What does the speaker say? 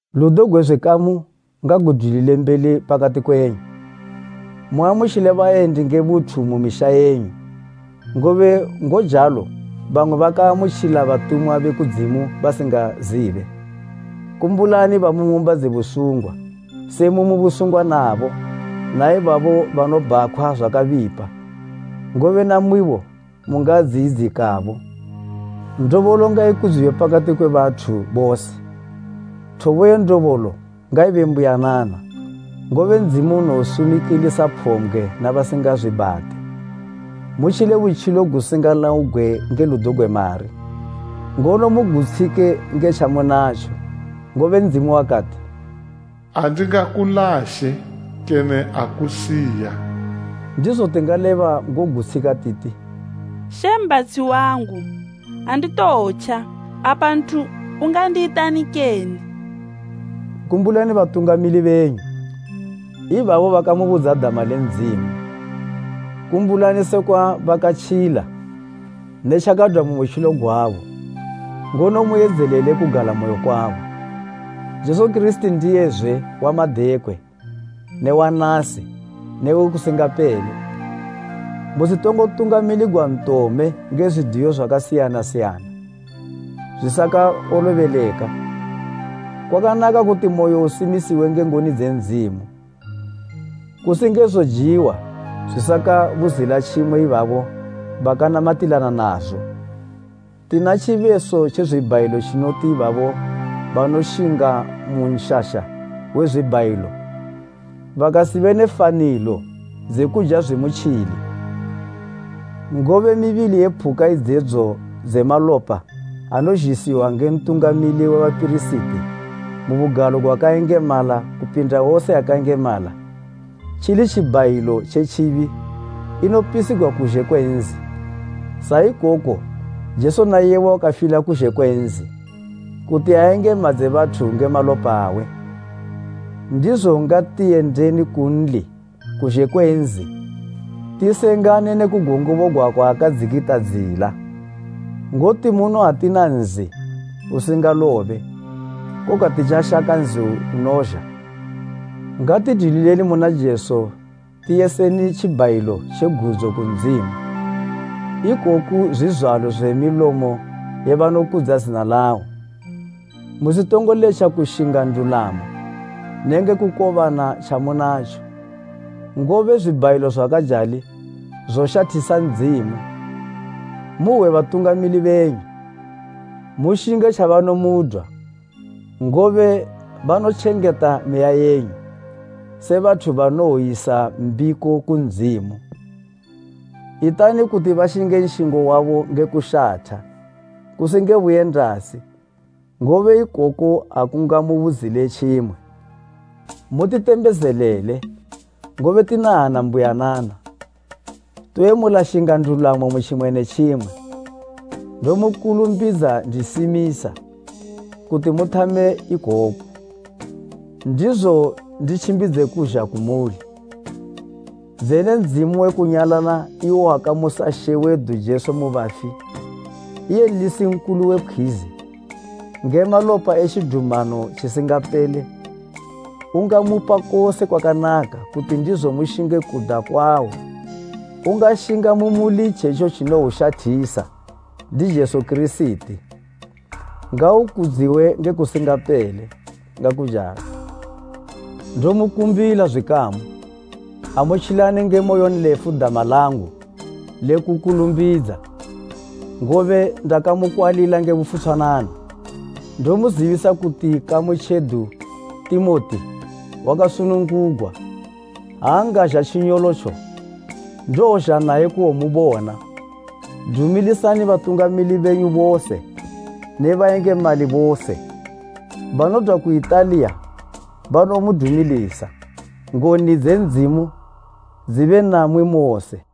Ludo gwe zwikamu ngagudwilile mbeli pakati kwenyu. Muamutjile bayendi nge buthu mu misha yenyu, ngobe ngojalo bamwe bakaamutjila batumwa be kudzimu basingazibe. Kumbulani bamu ng'umba dze busungwa, se mumu busungwa nabo na ibabo banobhakhwa zwakabipa, ngobe namwibo mungadziyidzikabo. Ndobolo ngaikudziwe pakati kwe bathu bose, thobo ye ndobolo ngaibe mbuyanana, ngobe Ndzimu unowosumikilisa phombgwe ne basinga zwibhate. Mutjile butjilo gusingalaugwe nge ludo gwe mari, ngono mugutshike nge tjamunatjo. Ngobe Ndzimu wakati, “Andingakulashe, kene akusiya.” Ndizo tingaleba ngogutshika titi, “She mbhatshi wangu. Anditowotja. Apa nthu ungandiyitani kene?” Kumbulani batungamili benyu, ibabo bakamubudza dama le Ndzimu. Kumbulani sekwa bakatjila ne tjakadwa mu butjilo gwabo, ngono muyidzelele kugalamoyo kwabo. Jesu Kirisiti ndiyezwe wa madekwe ne wa nasi newe kusingapele. Musitongo tungamiligwa ntome nge zwidiyo zwakasiyana siyana, zwisakawolobeleka. Kwakanaka kuti moyo uisimisiwe nge ngoni dze Ndzimu, kusi nge zojiwa zwisakabuzila tjimwe ibabo bakanamatilana nazo. Tina tjibeso tje zwibhayilo tjinoti ibabo banoshinga mu nshasha we zwibhayilo bakasibe ne fanilo dze kuja zwimutjili. Ngobe mibili ye phuka idzedzo dze malopa anozhisiwa nge Ntungamili we bapirisiti mu Bugalo gwakayengemala kupindisa, tjili tjibhayilo tje tjibi, inopisigwa kuzhe kwe nzi. Sa ikoko Jesu na iyebo wakafila kuzhe kwe nzi, kuti ayengemadze bathu nge malopa awe. Ndizo ngati yendeni kunli kuzhe kwe nzi, tisengane ne kugongobogwa kwaakadzikatidzila. Ngoti muno atina nzi usingalobe, koga titjashaka nzi unozha. Ngatidwilileni muna Jesu tiyiseni tjibhayilo tje gudzo ku Ndzimu, ikoku zwizwalo milomo ye banokudza zina lawo. Musitongo letja kushinga ndulamo nenge kukobana tjamunatjo, ngobe zwibhayilo zwakajali zoshathisa Ndzimu. Muhwe batungamili benyu, mushinge tjabanomudwa. Ngobe banotjengeta meya yenyu, se bathu banowoyisa mbiko ku Ndzimu. Itani kuti bashinge nshingo wabo nge kushatha, kusi nge buyendasi, ngobe ikoko akungamubuzile tjimwe. Mutitembezelele, ngobe tina hana mbuyanana. Toyemula shinga ndulamo mu tjimwe ne tjimwe. Ndomukulumbidza ndisimisa, kuti muthame ikoku, ndizo nditjimbidze kuzha kumuli. Dzene Ndzimu we kunyalala iwo wakamusa She wedu Jesu mu bafi, iye nlisi nkulu we pkhwizi, nge malopa e tjidumano tjisingapele, ungamupa kose kwakanaka kuti ndizo mushinge kuda kwawo ungashinga mu muli itjetjo tjinoushathisa, ndi Jesu Kirisiti. Ngaukudziwe nge kusingapele. Ngakujalo. Ndomukumbila, zwikamu, amutjilani nge moyonlefu dama langu le kukulumbidza, ngobe ndamukwalila nge bufutshwanana. Ndomuzibisa kuti ikamu tjedu Timoti, wakasunungugwa. Ha angazha tjinyolotjo, ndowozha naye kuwomubona. Dumilisani batungamili benyu bose ne bayengemali bose. Banodwa ku Italiya banomudumilisa. Ngoni dze Ndzimu dzibe namwi mose.